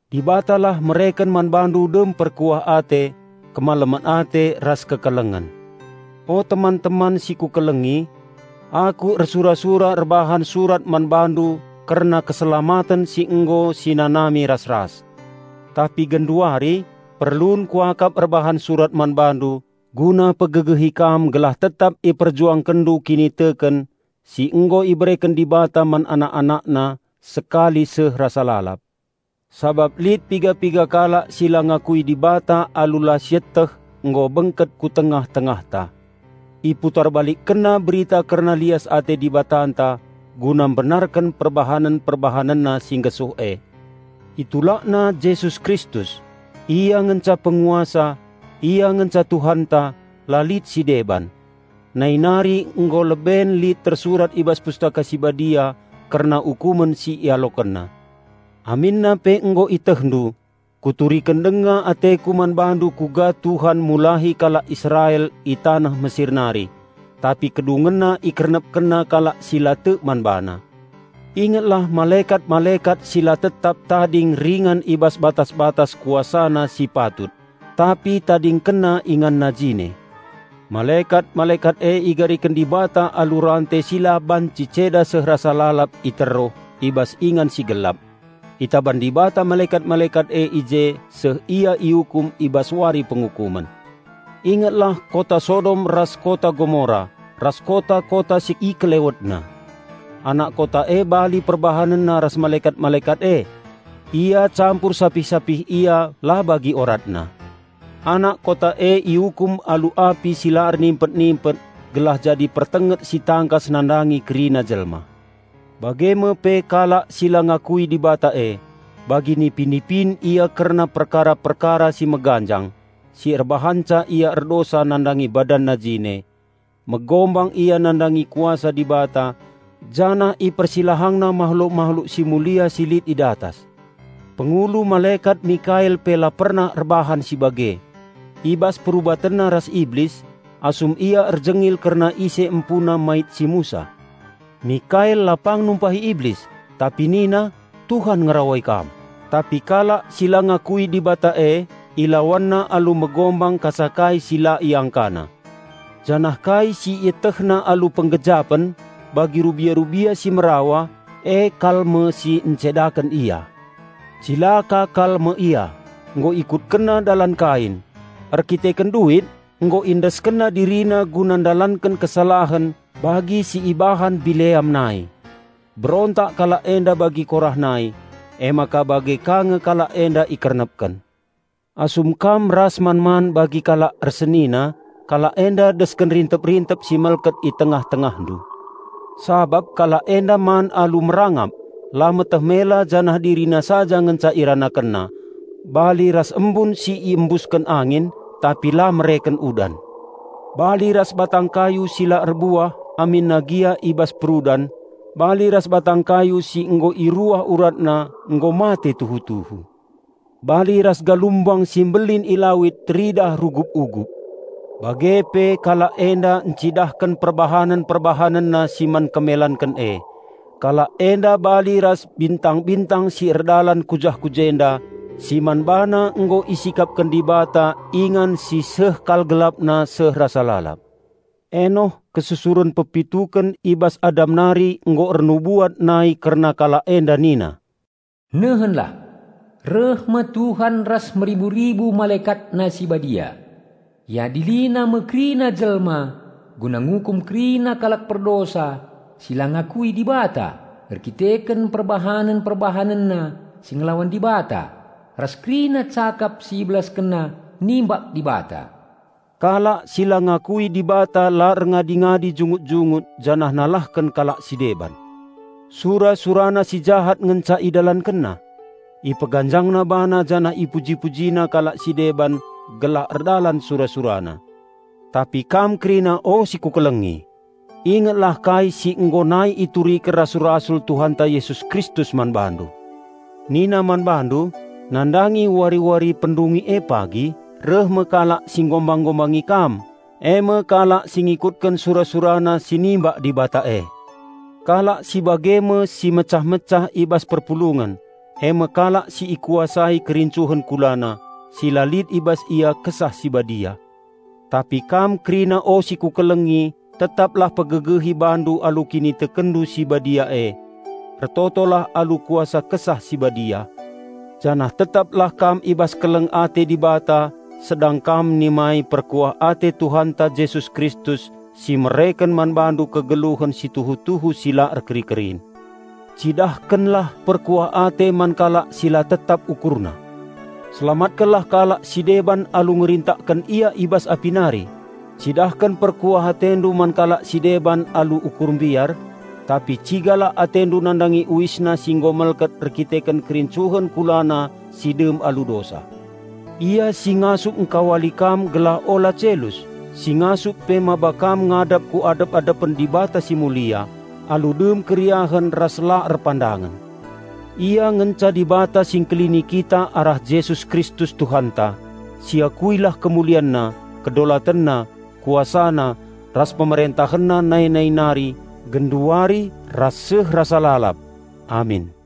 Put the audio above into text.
Dibatalah mereken man bandu dem perkuah ate, kemalemen ate ras kekelengen. O teman-teman si kukelengi! Aku ersura-sura erbahan surat man bandu kerna keselamaten si nggo sinanami ras-ras. Tapi genduari perlun kuakap erbahan surat man bandu guna pegegehi kam gelah tetap iperjuangkenndu kiniteken si nggo ibereken Dibata man anak-AnakNa sekali seh rasa lalap. Sabap lit piga-piga kalak si la ngakui Dibata alu la sieteh nggo bengket ku tengah-tengahta. Iputarbalikkenna berita kerna lias ate Dibatanta guna mbenarken perbahanen-perbahanenna si nggesuh e. Itulakna Jesus Kristus: Ia ngenca Penguasa, Ia ngenca Tuhanta, la lit sideban. Nai nari nggo leben lit tersurat i bas Pustaka Si Badia kerna ukumen si IalokenNa. Aminna pe nggo ietehndu, kuturiken denga ateku man bandu kuga Tuhan mulahi kalak Israel i taneh Mesir nari, tapi kedungenna IkernepkenNa kalak si la tek man BaNa. Ingetlah malekat-malekat si la tetap tading ringan i bas batas-batas kuasana si patut, tapi tadingkenna inganna jine. Malekat-malekat e igariken Dibata alu rante si la banci ceda seh rasa lalap i teruh i bas ingan si gelap. Itaban Dibata malekat-malekat e i je seh ia iukum i bas Wari Pengukumen. Ingetlah kota Sodom ras kota Gomora, ras kota-kota si i kelewetna. Anak kota e bali perbahanenna ras malekat-malekat e. Ia campur sapih-sapih ia la bagi oratna. Anak kota e iukum alu api si la ernimpet-nimpet gelah jadi pertenget si tangkas nandangi kerina jelma. Bage me pe, kalak si la ngakui Dibata e, bagi nipi-nipin ia kerna perkara-perkara si meganjang si erbahanca ia erdosa nandangi badanna jine. Megombang ia nandangi kuasa Dibata janah ipersilahangna mahluk-mahluk si mulia si lit i datas. Pengulu malekat Mikael pe la pernah erbahan si bage. I bas perubatenna ras Iblis, asum ia erjengil kerna ise empuna mait si Musa, Mikael la pang numpahi Iblis, tapi nina, "Tuhan ngerawai kam!" Tapi kalak si la ngakui Dibata e ilawanna alu megombang kasakai si la iangkana. Janah kai si ietehna alu penggejapen, bagi rubia-rubia si merawa, e kal me si encedaken ia. Cilaka kal me ia! Nggo ikutkenna dalan Kain. Erkiteken duit nggo iendeskenna dirina guna ndalanken kesalahen bagi si ibahan Bileam nai. Berontak kalak enda bagi Korah nai, emaka bage ka nge kalak enda ikernepken. Asum kam ras man-man bagi kalak ersenina, kalak enda desken rintep-rintep si melket i tengah-tengahndu. Sabap kalak enda man alu merangap, la meteh mela janah dirina saja ngenca iranakenna. Bali ras embun si iembusken angin, tapi la mereken udan. Bali ras batang kayu si la erbuah aminna gia i bas perudan. Bali ras batang kayu si nggo iruah uratna nggo mate tuhu-tuhu. Bali ras galumbang si mbelin i lawit teridah rugup-ugup; bage pe kalak enda ncidahken perbahanen-perbahanenna si man kemelanken e. Kalak enda bali ras bintang-bintang si erdalan ku jah-ku jenda, si man bana nggo isikapken Dibata ingan si seh kal gelapna seh rasa lalap. Enoh, kesusuren pepituken i bas Adam nari nggo ernubuat nai kerna kalak enda nina, "Nehenlah! Reh me Tuhan ras meribu-ribu MalekatNa si Badia; IadiliNa me kerina jelma guna ngukum kerina kalak perdosa si la ngakui Dibata erkiteken perbahanen-perbahanenna si ngelawan Dibata ras kerina cakap si ibelaskenna nimbak Dibata!" Kalak si la ngakui Dibata la erngadi-ngadi jungut-jungut janah nalahken kalak si deban. Sura-surana si jahat ngenca idalankenna. Ipeganjangna bana janah ipuji-pujina kalak si deban gelah erdalan sura-surana. Tapi kam kerina o si kukelengi! Ingetlah kai si nggo nai ituriken rasul-rasul Tuhanta Jesus Kristus man bandu. Nina man Bandu "Nandangi wari-wari pendungi e pagi reh me kalak si nggombang-gombangi kam, e me kalak si ngikutken sura-surana si nimbak Dibata e." Kalak si bage me si mecah-mecah i bas perpulungen, e me kalak si ikuasai kerincuhen kulana, si la lit i bas ia Kesah Si Badia. Tapi kam kerina o si kukelengi, tetaplah pegegehi bandu alu kinitekenndu si badia e. Ertotolah alu kuasa Kesah Si Badia, janah tetaplah kam i bas keleng ate Dibata sedang kam nimai perkuah ate Tuhanta Jesus Kristus si mereken man bandu kegeluhen si tuhu-tuhu si la erkeri-kerin. Cidahkenlah perkuah ate man kalak si la tetap ukurna. Selamatkenlah kalak si deban alu ngerintakken ia i bas api nari; cidahken perkuah atendu man kalak si deban alu ukur mbiar, tapi cigalah atendu nandangi uisna si nggo melket erdandanken kerincuhen kulana si dem alu dosa. Ia si ngasup ngkawali kam gelah ula celus, si ngasup pe maba kam ngadap ku adep-adepen Dibata si Mulia, alu dem keriahen ras la erpandangen -- Ia ngenca Dibata Si Ngkelini kita arah Jesus Kristus Tuhanta, si akuilah KemulianNa, KedolatenNa, KuasaNa, ras PemerentahenNa nai-nai nari, genduari, ras seh rasa lalap. Amin.